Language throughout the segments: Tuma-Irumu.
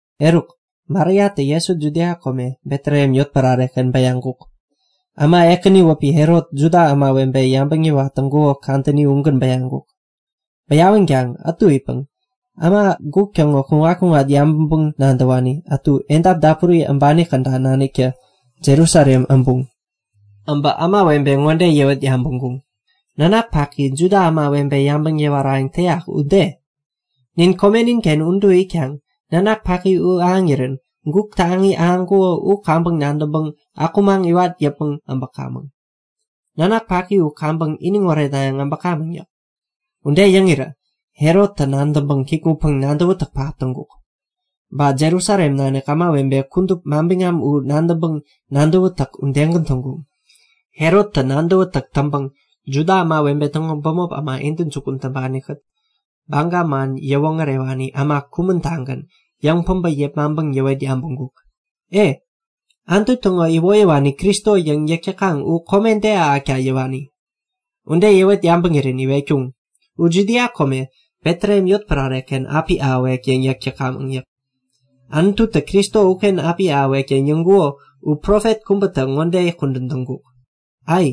Eruk Mariatä Jesu Judia kome, Betlehem yotpärare-ken bäyaŋkuk. Äma ekäni wäpi Herot Juda ämawebe yabäŋ yäwat täŋkuko kadäni ugän bäyaŋkuk. Bäyawänkaŋ ätu itpäŋ äma guk täŋo kuŋat-kuŋat yabäŋpäŋ-nadäwani ätu edap dapuri äbani käda naniktä Jerusalem äbuŋ. Äbä ämawebe ŋode yäwet yabäŋkuŋ; Nanak paki Juda ämawebe yabäŋ yäwarayäŋ täyak u de? Nin komenin-ken udu itkaŋ nanak paki u ahäŋirän guk taŋi ahäŋkuko u kaŋpäŋ nadäŋpäŋ akumaŋ iwat yäpmäŋ äbäkamäŋ. Nanak paki u kaŋpäŋ iniŋ oretnayäŋ äbäkamäŋ yäk. Ude yäŋirä Herottä nadäŋkaŋ kikŋutpäŋ nadäwätäk pähap täŋkuk. Ba Jerusalem nanik ämawebe kudup manbiŋam u nadäŋpäŋ nadäwätäk udegän täŋkuŋ. Herottä nadäwätäk täŋpäŋ Juda ämawebe täŋo bämop äma intäjukun täŋpani-kät Baga man yäwoŋärewani äma kumän-tagän yäŋ-päbä yepmaŋpäŋ yäwet yabäŋkuk; E, Anutu täŋo iwoyäwani Kristo yäŋ yäk täkaŋ u kome de ahäkta yäwani? Ude yäwet yabäŋirän iwetkuŋ; U Judia kome Betlehem yotpärare-ken api ahäwek yäŋ yäk täkamäŋ yäk. Anututä Kristo uken api ahäwek yäŋ yäŋkuko u profet kubätä ŋode kudän täŋkuk; Ai!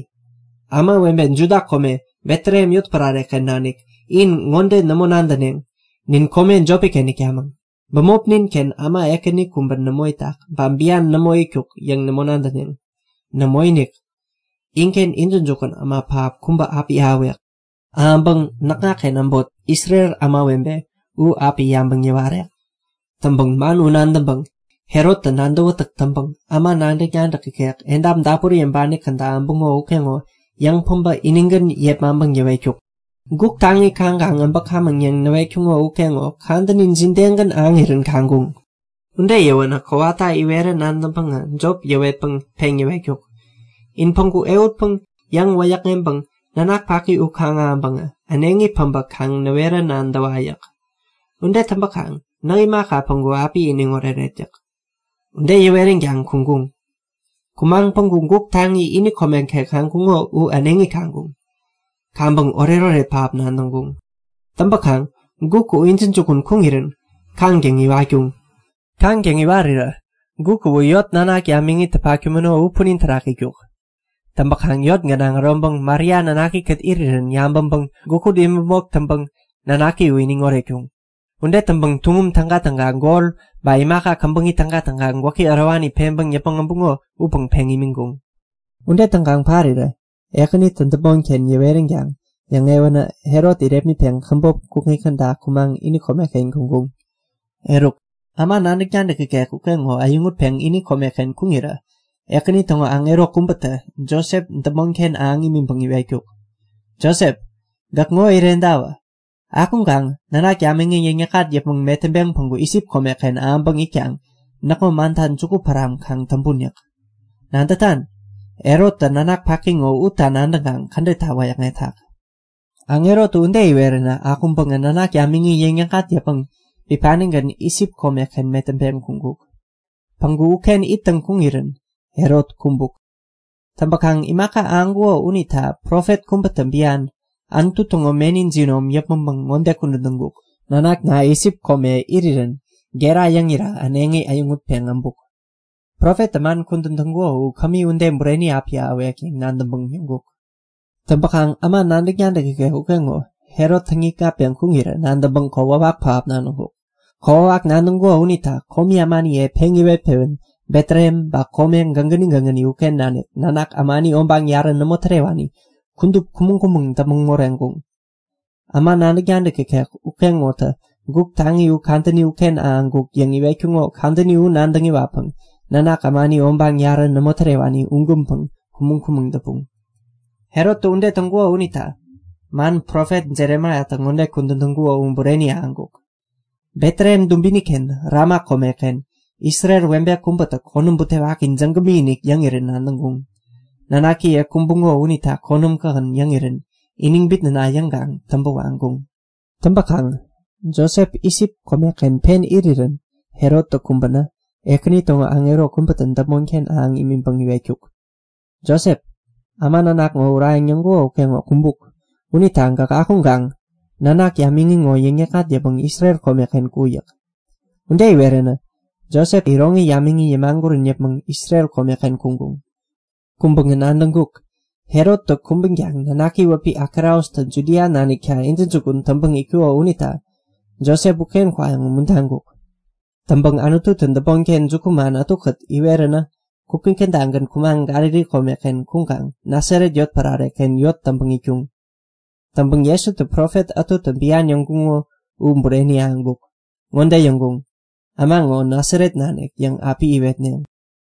Ämawebe Juda kome Betlehem yotpärare-ken nanik, in ŋode nämo nadäneŋ; Nin kome jopi-ken itkamäŋ. Bämopnin-ken äma ekäni kubä nämo itak, ba bian nämo itkuk yäŋ nämo nadäneŋ. Nämoinik! Inken intäjukun äma pähap kubä api ahäwek. Ahäŋpäŋ näkŋaken äbot, Isrel ämawebe u api yabäŋ yäwarek. Täŋpäŋ Herottä man u nadäŋpäŋ nadäwätäk täŋpäŋ äma nadäk-nadäk ikek edap dapuri äbani käda äbuŋo ukeŋo yäŋ-päbä inigän yepmaŋpäŋ yäwetkuk; Guk taŋi kaŋkaŋ äbäkamäŋ yäŋ näwetkuŋo ukeŋo kadäni jidegän ahäŋirän kaŋkuŋ? Ude yäwänä kowata iwerä nadäŋpäŋä jop ŋode yäwetpäŋ peŋ yäwetkuk; In päŋku ehutpäŋ yäŋ-wäyäkŋeŋpäŋ nanak paki u kaŋ-ahäŋpäŋä äneŋi päbä kaŋ näwerä nadäwa. Ude täŋpäkaŋ näk imaka, päŋku api iniŋ oreret yäk. Ude yäweränkaŋ kuŋkuŋ. Kumaŋ päŋku guk taŋi ini komeken kaŋkuŋo u äneŋi kaŋkuŋ. Kaŋpäŋ oretoret pähap nadäŋkuŋ. Täŋpäkaŋ guk u intäjukun kuŋirän kaŋtäŋ iwatkuŋ. Kaŋtäŋ iwarirä guk uwä yot nanak yamiŋitä patkumäno u punin terak itkuk. Täŋpäkaŋ yot gänaŋ äroŋpäŋ Maria nanakikät irirän yabäŋpäŋ gukut imäpmok täŋpäŋ nanaki u iniŋ oretkuŋ. Ude täŋpäŋ tuŋum tägatäga, gol ba imaka käbäŋi tägatäga gwäki ärowani peŋpäŋ yäpmäŋ äbuŋo upäŋ peŋ imiŋkuŋ. Ude täŋkaŋ parirä Ekänitä däpmonken yäweränkaŋ yäŋewänä Herot irepmitpeŋ käbop kukŋi kädagän kumaŋ ini komeken kuŋkuŋ. Eruk äma nadäk-nadäk ikek ukeŋo äyäŋutpeŋ ini komeken kuŋirä Ekäni täŋo aŋero kubätä Josep däpmonken ahäŋ imiŋpäŋ iwetkuk; Josep, gäk ŋo irentawä. Akuŋkaŋ nanak yamiŋi yäŋ-yäkŋat yäpmäŋ metäŋpeŋ päŋku Isip komeken ahäŋpäŋ itkaŋ näkŋo manta juku päram kaŋ täŋpun yäk. Nadätan? Herottä nanak paki ŋo utta nadäŋkaŋ kädetta wäyäkŋetak. Aŋerotä ude iweränä akuŋpäŋä nanak yamiŋi yäŋ-yäkŋat yäpmäŋ bipanigän Isip komeken metäŋpeŋ kuŋkuk. Päŋku uken ittäŋ kuŋirän Herot kumbuk. Täŋpäkaŋ imaka ahäŋkuko unita profet kubätä bian, Anutu täŋo meni jinom yäpmäŋpäŋ ŋode kudän täŋkuk; Nanakna Isip komeken irirän gera yäŋira äneŋi äyäŋutpeŋ äbuk. Profettä man kudän täŋkuko u kämi ude bureni api ahäwek yäŋ nadäŋpäŋ yäŋkuk. Täŋpäkaŋ äma nadäk-nadäk ikek ukeŋo Herot täŋikŋatpeŋ kuŋirä nadäŋpäŋ kokwawak pähap nadäŋkuk. Kokwawak nadäŋkuko unita komi ämaniye peŋ yäwet-pewän Betlehem ba kome gägäni gägäni uken nanik nanak ämani obaŋ yarä nämo tärewani kudup kumäŋ-kumäŋ däpmäŋ moreŋkuŋ. Äma nadäk-nadäk ikek ukeŋonitä guk taŋi u kadäni uken ahäŋkuk yäŋ iwetkuŋo kadäni u nadäŋ iwatpäŋ nanak ämani obaŋ yarä nämo tärewani ugänpäŋ kumäŋ-kumäŋ däpuŋ. Herottä ude täŋkuko unita man profet Jeremaiatä ŋode kudän täŋkuko u bureni ahäŋkuk; Betlehem dubini-ken Rama komeken Isrel webe kubätä konäm butewaki jägämi-inik yäŋirän nadäŋkuŋ. Nanakiye kumbuŋo unita konäm kähän yäŋirän iniŋ bitnäna yäŋkaŋ täŋpä waŋkuŋ. Täŋpäkaŋ Josep Isip komeken pen irirän Herottä kumbänä Ekäni täŋo aŋero kubätä däpmonken ahäŋ imiŋpäŋ iwetkuk; Josep, äma nanak ŋo urayäŋ yäŋkuko ukeŋo kumbuk. Unita gäk akuŋkaŋ nanak yamiŋi ŋo yäŋ-yäkŋat yäpmäŋ Isrel komeken ku yäk. Ude iweränä Josep iroŋi yamiŋi yämagurän yäpmäŋ Isrel komeken kuŋkuŋ. Kuŋpäŋä nadäŋkuk; Herottä kumbänkaŋ nanaki wäpi Akelaustä Judia nanikta intäjukun täŋpäŋ itkuko unita Josep uken kwayäŋ umuntaŋkuk. Täŋpäŋ Anututä däpmonken jukuman ätukät iweränä kukŋi kädagän kumaŋ Galili komeken kuŋkaŋ Nasaret yotpärare-ken yot täŋpäŋ itkuŋ. Täŋpäŋ Jesuta profet ätutä bian yäŋkuŋo u bureni ahäŋkuk. Ŋode yäŋkuŋ; Äma ŋo Nasaret nanik yäŋ api iwetneŋ.